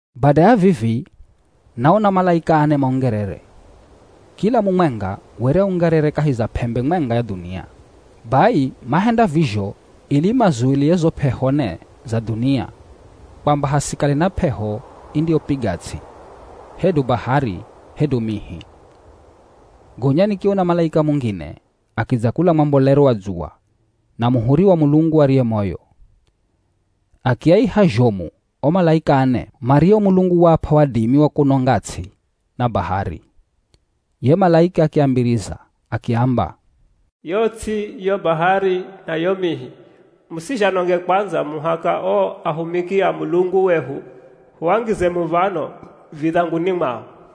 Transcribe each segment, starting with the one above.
Bada ya vivi, naona malaika ane maungerere. Kila mumwenga were aungerere kahi za p'embe mwenga ya dhunia. Bai mahenda vizho ili mazulie zo p'eho ne za dhunia kwamba hasikale na p'eho indiyopiga ts'i, hedu bahari, hedu mihi. Gonya nikiona malaika mungine akidza kula mwambolero wa dzuwa na muhuri wa Mulungu ariye moyo. Akiaiha zhomu o malaika ane mario Mulungu waap'a wadimi wa kunonga ts'i na bahari. Ye malaika akiambiriza akiamba, “Yo ts'i, yo bahari, na yo mihi, musizhanonge kwandza muhaka o ahumiki a Mulungu wehu huangize muv̱ano vidhanguni mwao.”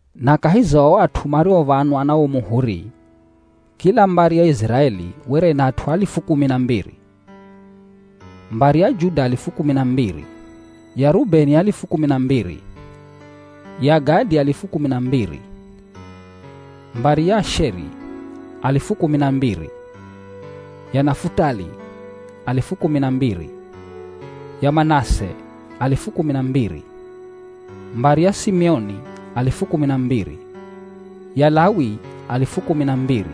Na kahi za o at'u mariov̱anwa na wo muhuri, kila mbari ya Iziraeli were ina at'u alifu kumi na mbiri. Mbari ya Juda alifu kumi na mbiri, ya Rubeni alifu kumi na mbiri, ya Gadi alifu kumi na mbiri. Mbari ya Asheri, alifu kumi na mbiri, ya Nafutali alifu kumi na mbiri, ya Manase alifu kumi na mbiri. Mbari ya Simioni alifu kumi na mbiri, ya Lawi alifu kumi na mbiri,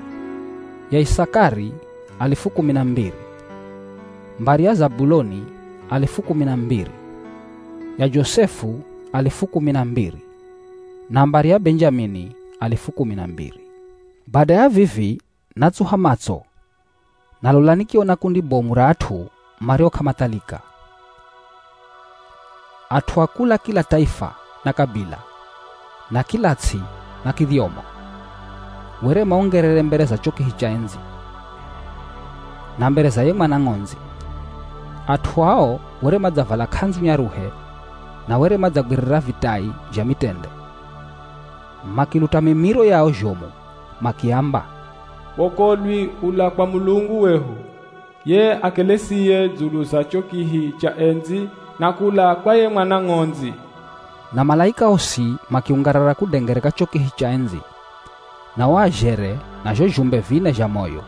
ya Isakari alifu kumi na mbiri. Mbari ya Zabuloni alifu kumi na mbiri, ya Josefu alifu kumi na mbiri, na mbari ya Benjamini alifu kumi na mbiri. Bada ya vivi natsuha matso, na lola nikiona kundi bomu ra at'u mario k'amathalika. At'u a kula kila taifa na kabila, na kila ts'i na kidhyomo. Were maungerere mbere za cho kihi cha endzi, na mbere za ye Mwana Ng'ondzi. At'u ao were madzavala k'andzu nyaruhe na were madzagwirira vitai zha mitende. Makiluta mimiro yao zhomu makiamba, “Wokolwi ula kwa Mulungu wehu, ye akelesiye dzulu za cho kihi cha endzi na kula kwa ye Mwana Ng'ondzi.” Na malaika osi makiungarara kudengereka cho kihi cha endzi na o azhere na zho zhumbe vine zha moyo.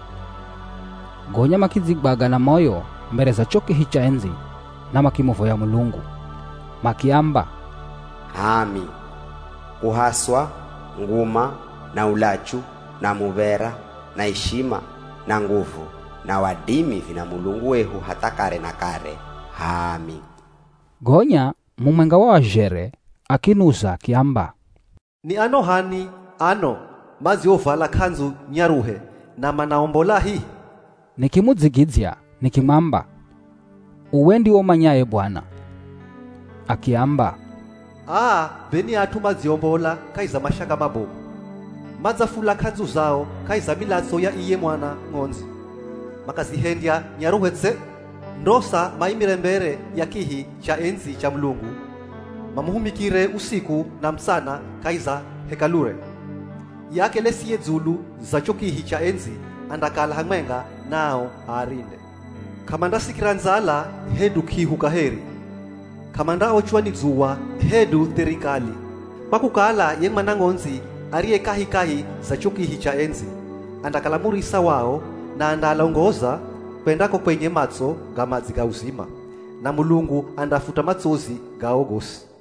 Gonya makidzigwaga na moyo mbere za cho kihi cha endzi na makimuvoya Mulungu. Makiamba, “H'aami. Kuhaswa, nguma, na ulachu, na muv̱era na ishima, na nguvu na wadimi vina Mulungu wehu hatha kare na kare. H'aami.” Gonya mumwenga wa o azhere akinuza akiamba, “Ni ano h'ani ano madziovala k'andzu nyaruhe na manaombolahi?” Nikimudzigidzya nikimwamba, “Uwe ndiwe umanyaye bwana.” Akiamba, “Aa be ni at'u madziombola kahi za mashaka mabomu. Madzafula k'andzu zao kahi za milatso ya iye Mwana Ng'ondzi, makazihendya nyaruhe tse. Ndosa maimire mbere ya kihi cha endzi cha Mulungu, mamuhumikire usiku na mutsana kahi za Hekalure. Ye akelesiye dzulu za cho kihi cha endzi andakala hamwenga nao aarinde. K'amandasikira ndzala hedu k'ihu kaheri. K'amandaochwa ni dzuwa hedu theri kali. Kwa kukala ye Mwana Ng'ondzi ariye kahikahi za cho kihi cha endzi, andakala murisa wao na andaalongoza kwenda ko kwenye matso ga madzi ga uzima. Na Mulungu andaafuta matsozi gao gosi.”